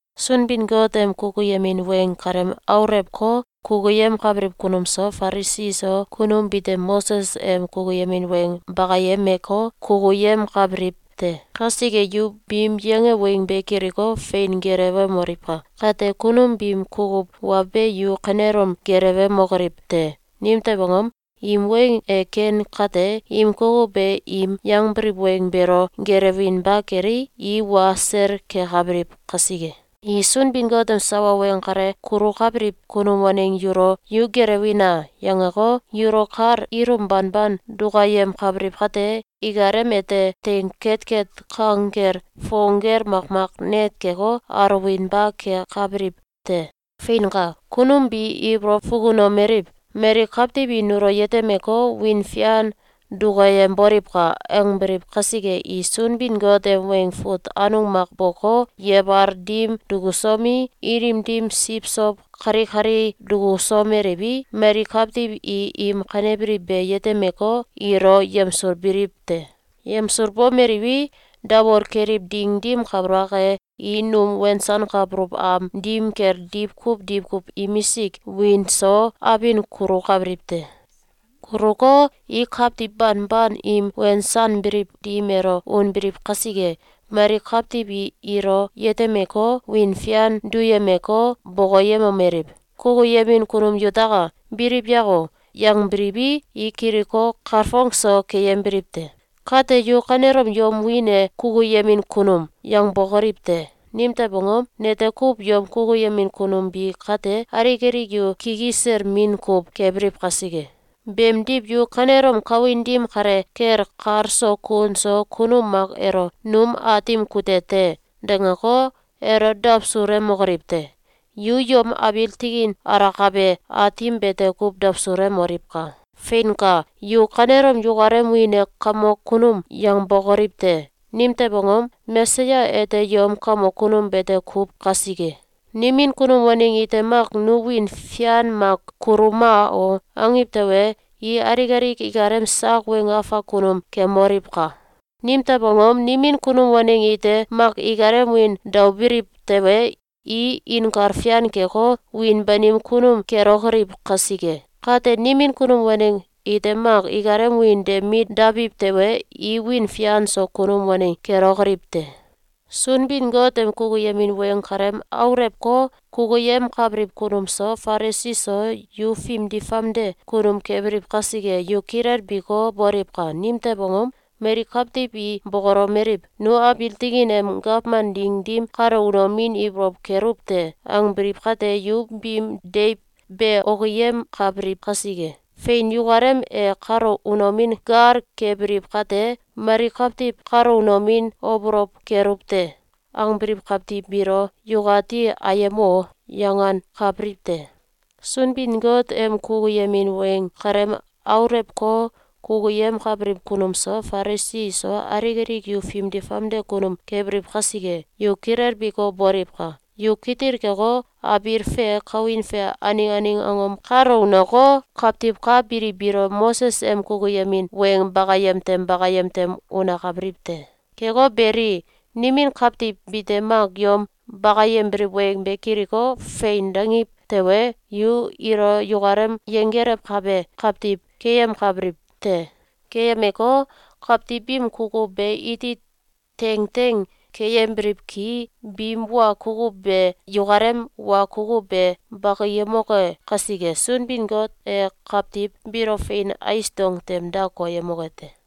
“Sunbin-Got em kukuyemin weng kalem aulewko, kukuyemkabiliw kunum so, Falisi iso, kunum bite Moses em kukuyemin weng bakayemeko, kukuyemkabiliw te! Kasike, yu biim yange weng be kiliko, fein gelewemoliwka! Kate, kunum biim kukuw wa be yu kanelom gelewemokoliw te! Nimtew angom? Im weng e ken kate, im kukuw be im yangbiliw weng beelo gelewinba kelei, i wa sel kekabiliw kasike. I Sunbin-Got em sawa weng kale kulukabiliw kunum waneng yulo ‘Yu gelewina!’, yangeko, yulo kal ilum banban dukayemkabiliw kate, ikalem ete teing ketket kang gel fong gel makmak net keko, aluwinba kekabiliw te. Feinka! Kunum bi ibolow fukunomeliw: ‘Mali kawtiw i nulo yetemeko, wiin fian dukayemboliwka!’, angbiliw kasike, i Sunbin-Got em weng fut anung mak boko, yebal dim dukusomi, ilim dim siwsow kalikali dukusomeliwi, mali kawtiw i im kanebiliw be yetemeko, ilo yemsulbiliw te. Yemsulbomeliwi, dawol keliw ding dim kabalak e, i num wensankabuluw am dim kel diwkuw diwkuw imisk wiin so abin kulukabiliw te. Kuluko, i kawtiw banban im wensanbiliw dim elo unbiliw kasike, mali kawtiw i ilo yetemeko, wiin fian duyemeko, bokoyemomeliw: ‘Kukuyemin kunum yutaka! Biliw yako!’, yangbiliwi, i kiliko, kalfong so keyembiliw te. Kate yu kanelom yom wiin e ‘Kukuyemin kunum!’, yangbokoliw te! Nimtew angom? Nete kuw yom kukuyemin kunum bi kate, alik alik yu kikisel min kuw kebiliw kasike. Beemdiw, yu kanelom kawin dim kale kel kal so kun so kunum mak elo ‘Num aatim kute te!’, dangeko, elo dawsulemokoliw te! Yu yom abiil tikin alakabe Aatim bete kuw dawsulemoliwka! Feinka! Yu kanelom yukalem wiin e ‘Kamok kunum!’, yangbokoliw te! Nimtew angom? Mesaya ete yom kamok kunum bete kuw kasike. Nimin kunum waneng ite mak ‘Nu wiin fian mak kuluma o!’, angiw tewe, i alik alik ikalem sak weng afak kunum kemoliwka! Nimtew angom? Nimin kunum waneng ite mak ikalem wiin daobiliw tewe, i inkal fian keko, wiin banim kunum kelokoliw kasike. Kate, nimin kunum waneng ite mak ikalem wiin de mit dabiw tewe, i wiin fian so kunum waneng kelokoliw te. Sunbin-Got em kukuyemin weng kalem aulewko, kukuyemkabiliw kunum so, Falisi so, yu fimdi famde kunum kebiliw kasike, yu kilelbiko, boliwka! Nimtew angom? Mali kawtiw i bokolomeliw: ‘Nu abiil tikin em gawman ding dim kalo unomin ibolow keluw te!’, angebiliw kate, yu biim deiw be okiyemkabiliw kasike. Fein! Yukalem e kalo unomin gal kebiliw kate, mali kawtiw ‘Kalo unomin obolow keluw te!’, angbiliw kawtiw biilo yukati ‘Ayem o!’, yangankabiliw te. Sunbin-Got em kukuyemin weng kalem aulewko, kukuyemkabiliw kunum so, Falisi iso, alik alik yu fimdi famde kunum kebiliw kasike, yu kilelbiko, boliwka! Yu kitil keko, abiil fe kawin fe aneng aneng angom kalo uneko, kawtiw ka biliw biilo Moses em kukuyemin weng bakayem tem bakayem tem unakabiliw te. Keko beli, nimin kawtiw bite mak yom bakayembiliw weng be kiliko, ‘Fein!’, dangiw tewe, yu ilo yukalem yenggelewkabe kawtiw keyemkabiliw te. Keyemeko, kawtiw biim kukuw be iti teng teng keyembiliw ki, biim wa kukuw be yukalem wa kukuw be bakiyemoke kasike, Sunbin-Got e kawtiw biilo fein ais dong tem da koyemoke te.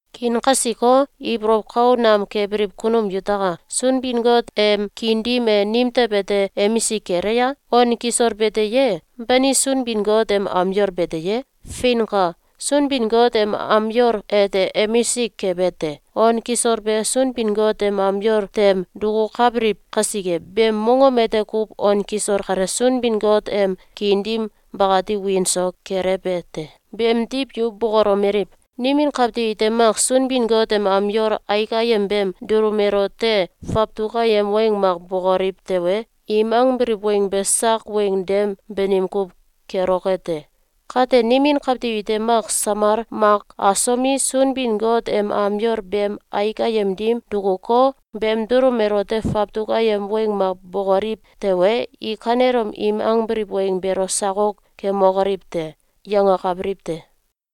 Kiin kasiko, ibolow kau nam kebiliw kunum yutaka! Sunbin-Got em kiin dim e nimtew ete emisik kele a? On kisol bete ye? Bani Sunbin-Got em am yol bete ye? Feinka! Sunbin-Got em am yol ete emisik kebe te! On kisol be Sunbin-Got em am yol tem dukukabiliw kasike, beem mongom ete kuw on kisol kale Sunbin-Got em kiin dim bakati wiin so kelewbe te. Beemdiw yu bokolomeliw: ‘Nimin kawtiw ite mak Sunbin-Got em am yol aik ayem beem dulum elote fawtuk ayem weng mak bokoliw tewe, im angbiliw weng be sak weng dem banim kuw keloke te. Kate, nimin kawtiw ite mak samal mak asomi, Sunbin-Got em am yol beem aik ayem dim dukuko, beem dulum elote fawtuk ayem weng mak bokoliw tewe, i kanelom im angbiliw weng beelo sakok kemokoliw te!’, yangakabiliw te.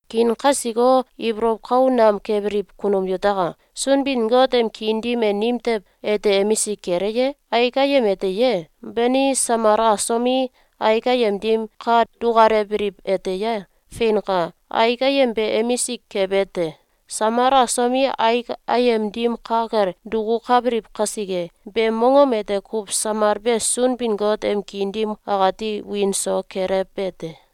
Kiin kasiko, ibolow kau nam kebiliw kunum yutaka! Sunbin-Got em kiin dim e nimtew ete emisik kele ye? Aik ayem ete ye? Bani, samal asomi, aik ayem dim ka dukalewbiliw ete ye? Feinka! Aik ayem be emisik kebe te! Samal asomi, aik ayem dim ka kel dukukabiliw kasike, beem mongom ete kuw samal be Sunbin-Got em kiin dim akati wiin so kelewbe te.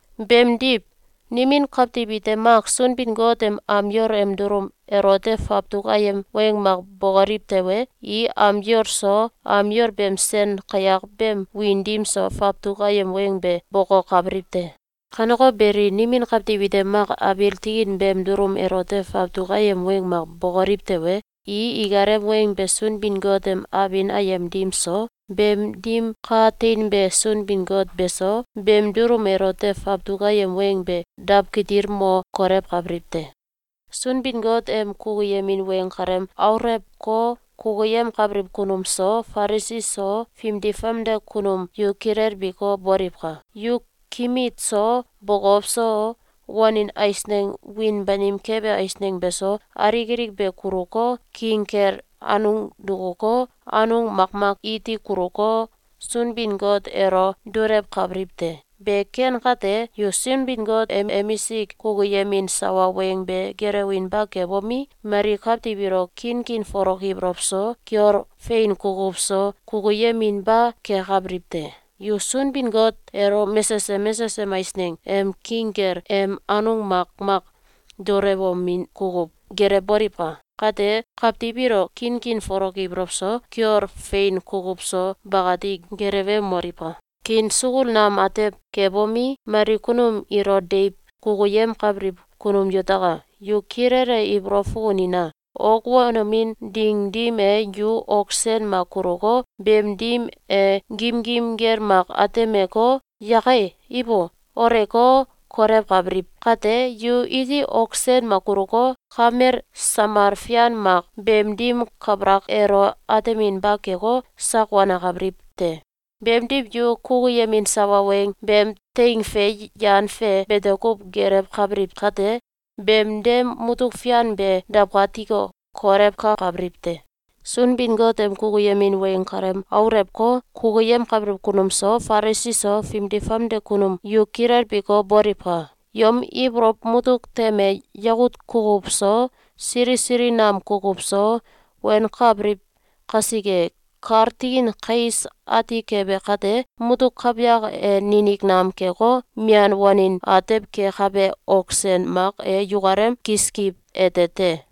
Beemdiw, nimin kawtiw ite mak Sunbin-Got em am yol em dulum elote fawtuk ayem weng mak bokoliw tewe, i am yol so, am yol beem sen kayak beem wiin dim so, fawtuk ayem weng be bokokabiliw te. Kaneko beli, nimin kawtiw ite mak abiil tikin beem dulum elote fawtuk ayem weng mak bokoliw tewe, i ikalem weng be Sunbin-Got em abin ayem dim so, beem dim ka teinbe Sunbin-Got beso, beem dulum elote fawtuk ayem weng be dawkitil mo kolewkabiliw te. Sunbin-Got em kukuyemin weng kalem aulewko, kukuyemkabiliw kunum so, Falisi so, fimdi famde kunum yu kilelbiko, boliwka! Yu kimit so, bokow so, wanin eisneng wiin banim kebe eisneng beso, alik alik be kuluko, king kel anung dukuko, anung makmak iti kuluko, Sunbin-Got elo dulewkabiliw te. Be ken kate, yu Sunbin-Got em emisik kukuyemin sawa weng be gelewinba kebomi, mali kawtiw ilo kinkin folok ibolow so, kiol fein kukuw so, kukuyeminba kekabiliw te. Yu Sunbin-Got elo mesesem mesesem eisneng em king kel em anung makmak dulewomin kukuw gelewboliwka! Kate, kawtiw ilo kinkin folok ibolow so, kiol fein kukuw so, bakati gelewemoliwka! Kiin sukul nam atew kebomi, mali kunum ilo deiw kukuyemkabiliw kunum yutaka! Yu kilele ibolow fukunina! Ok wanomin ding dim e, yu ok sen mak kuluko, beem dim e gimgim gel mak atemeko, ‘Yake! Ibo!’, oleko, kolewkabiliw kate, yu iti ok sen mak kuluko, kamel samal fian mak beem dim kabalak elo ateminba keko, sak wanakabiliw te. Beemdiw, yu kukuyemin sawa weng beem teing fe yan fe bete kuw gelewkabiliw kate, beem dem mutuk fian be dawkatiko, kolewkakabiliw te! Sunbin-Got em kukuyemin weng kalem aulewko, kukuyemkabiliw kunum so, Falisi so, fimdi famde kunum yu kilelbiko, boliwka! Yom ibolow mutuk tem e yakut kukuw so, sili sili nam kukuw so wenkabiliw kasike, kal tikin kais ati kebe kate, mutuk kawyak e ninik nam keko, mian wanin atew kekabe ok sen mak e yukalem kiskiw ete te.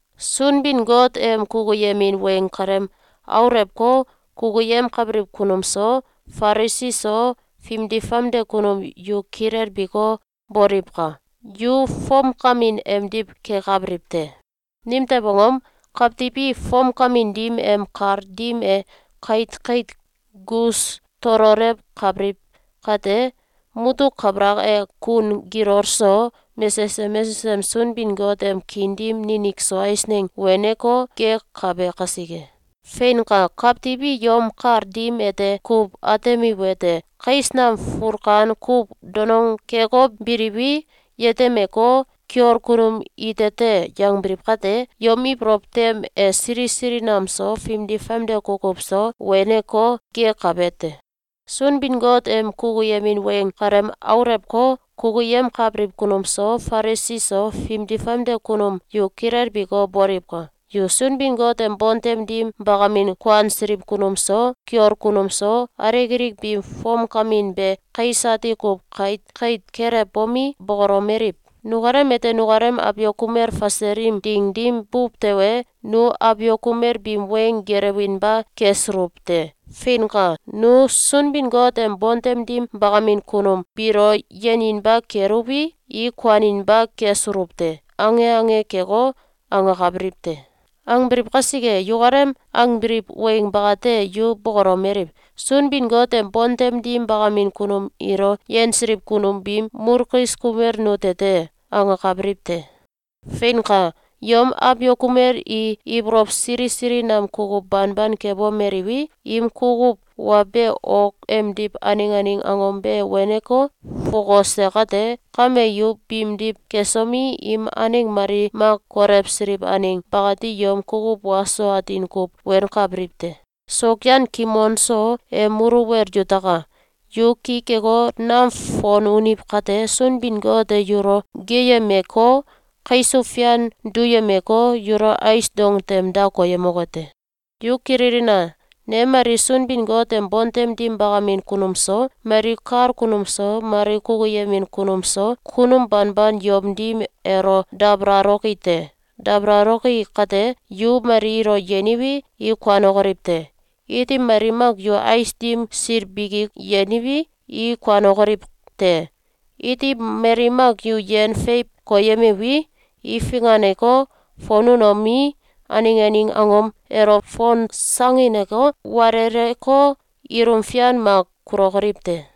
Sunbin-Got em kukuyemin weng kalem aulewko, kukuyemkabiliw kunum so, Falisi so, fimdi famde kunum yu kilelbiko, boliwka! Yu fomkamin emdiw kekabiliw te. Nimtew angom? Kawtiw i fomkamin dim em kal dim e kait kait gus tololewkabiliw kate, mutuk kabalak e kun gilol so, mesesem mesesem Sunbin-Got em kiin dim ninik so eisneng weneko, gek kabe kasike. Feinka! Kawtiw i yom kal dim ete kuw atemiwete: Kais nam fulkan kuw donong keko biliwi, yetemeko, ‘Kiol kunum ite te!’, yangbiliw kate, yom ibolow tem e sili sili nam so, fimdi famde kukuw so, weneko, gek kabe te. Sunbin-Got em kukuyemin weng kalem aulewko, kukuyemkabiliw kunum so, Falisi so, fimdi famde kunum yu kilelbiko, boliwka! Yu Sunbin-Got em bontem dim bakamin kuansiliw kunum so, kiol kunum so, alik alik biim fomkamin be kais ati kuw kait kait kelewbomi, bokolomeliw: ‘Nukalem ete nukalem abiok kumel fasel im ding dim buw tewe, nu abiok kumel biim weng gelewinba kesuluw te. Feinka! Nu Sunbin-Got em bontem dim bakamin kunum biilo yeninba keluwi, i kuaninba kesuluw te.’, ange ange keko, angakabiliw te. Angbiliw kasike, yukalem angbiliw weng bakate, yu bokolomeliw: ‘Sunbin-Got em bontem dim bakamin kunum ilo yensiliw kunum biim mulkis kumel nute te!’, angakabiliw te. Feinka! Yom abiok kumel i ibolow sili sili nam kukuw banban kebomeliwi, im kukuw wa be ok emdiw aneng aneng angom be weneko, fokose kate, kame, yu biimdiw kesomi, im aneng mali mak kolewsiliw aneng bakati yom kukuw wa so atin kuw wenkabiliw te! Sokyan kimon so em muluwel yutaka! Yu ki keko, nam fon uniw kate, Sunbin-Got e yulo geeyemeko, kaisuw fian duyemeko, yulo ais dong tem da koyemoke te. Yu kililina! Ne mali Sunbin-Got em bontem dim bakamin kunum so, mali kal kunum so, mali kukuyemin kunum so, kunum banban yom dim elo dabalaloki te. Dabalaloki kate, yu mali ilo yeniwi, i kuanokoliw te. Iti mali mak yu ais dim sil biki yeniwi, i kuanokoliw te. Iti mali mak yu yen feiw koyemiwi, i finganeko, fon unomi, aneng aneng angom elo fonsangineko, waleleko, ilum fian mak kulokoliw te.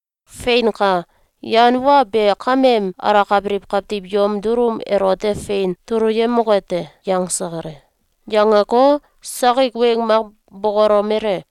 Feinka! Yan wa be kameem alakabiliw kawtiw yom dulum elote fein tuluyemoke te.”, yangse kale. Yangeko, sakik weng mak bokolomele: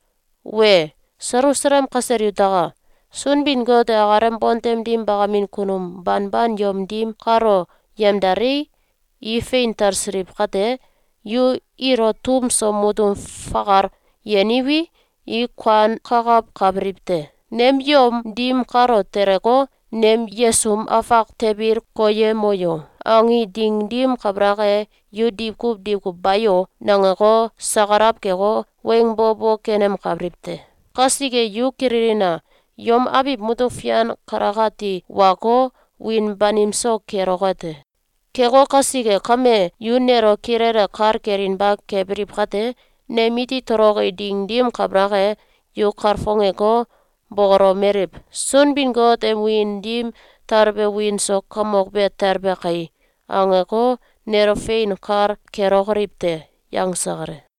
“Wee! Selusalem kasel yutaka! Sunbin-Got e akalem bontem dim bakamin kunum banban yom dim kalo yemdalei, i fein talsiliw kate, yu ilo tum so mutum fakal yeniwi, i kuankakawkabiliw te. Nem yom dim kalo teleko, ‘Nem yesum afak tebil koyemo yo!’, angi ding dim kabalak e, yu diwkuw diwkuw ‘Bayo!’, nangeko, sakalaw keko, weng bo bo kenemkabiliw te. Kasike, yu kililina! Yom abiw mutuk fian kalakati wako, wiin banim so keloke te. Keko kasike kame, yu nelo kilele kal kelinba kebiliw kate, nem iti toloki ding dim kabalak e, yu kalfongeko, bokolomeliw: ‘Sunbin-Got em wiin dim talbe wiin so kamok be talbe kai!’, angeko, nelo fein kal kelokoliw te.” yangse kale.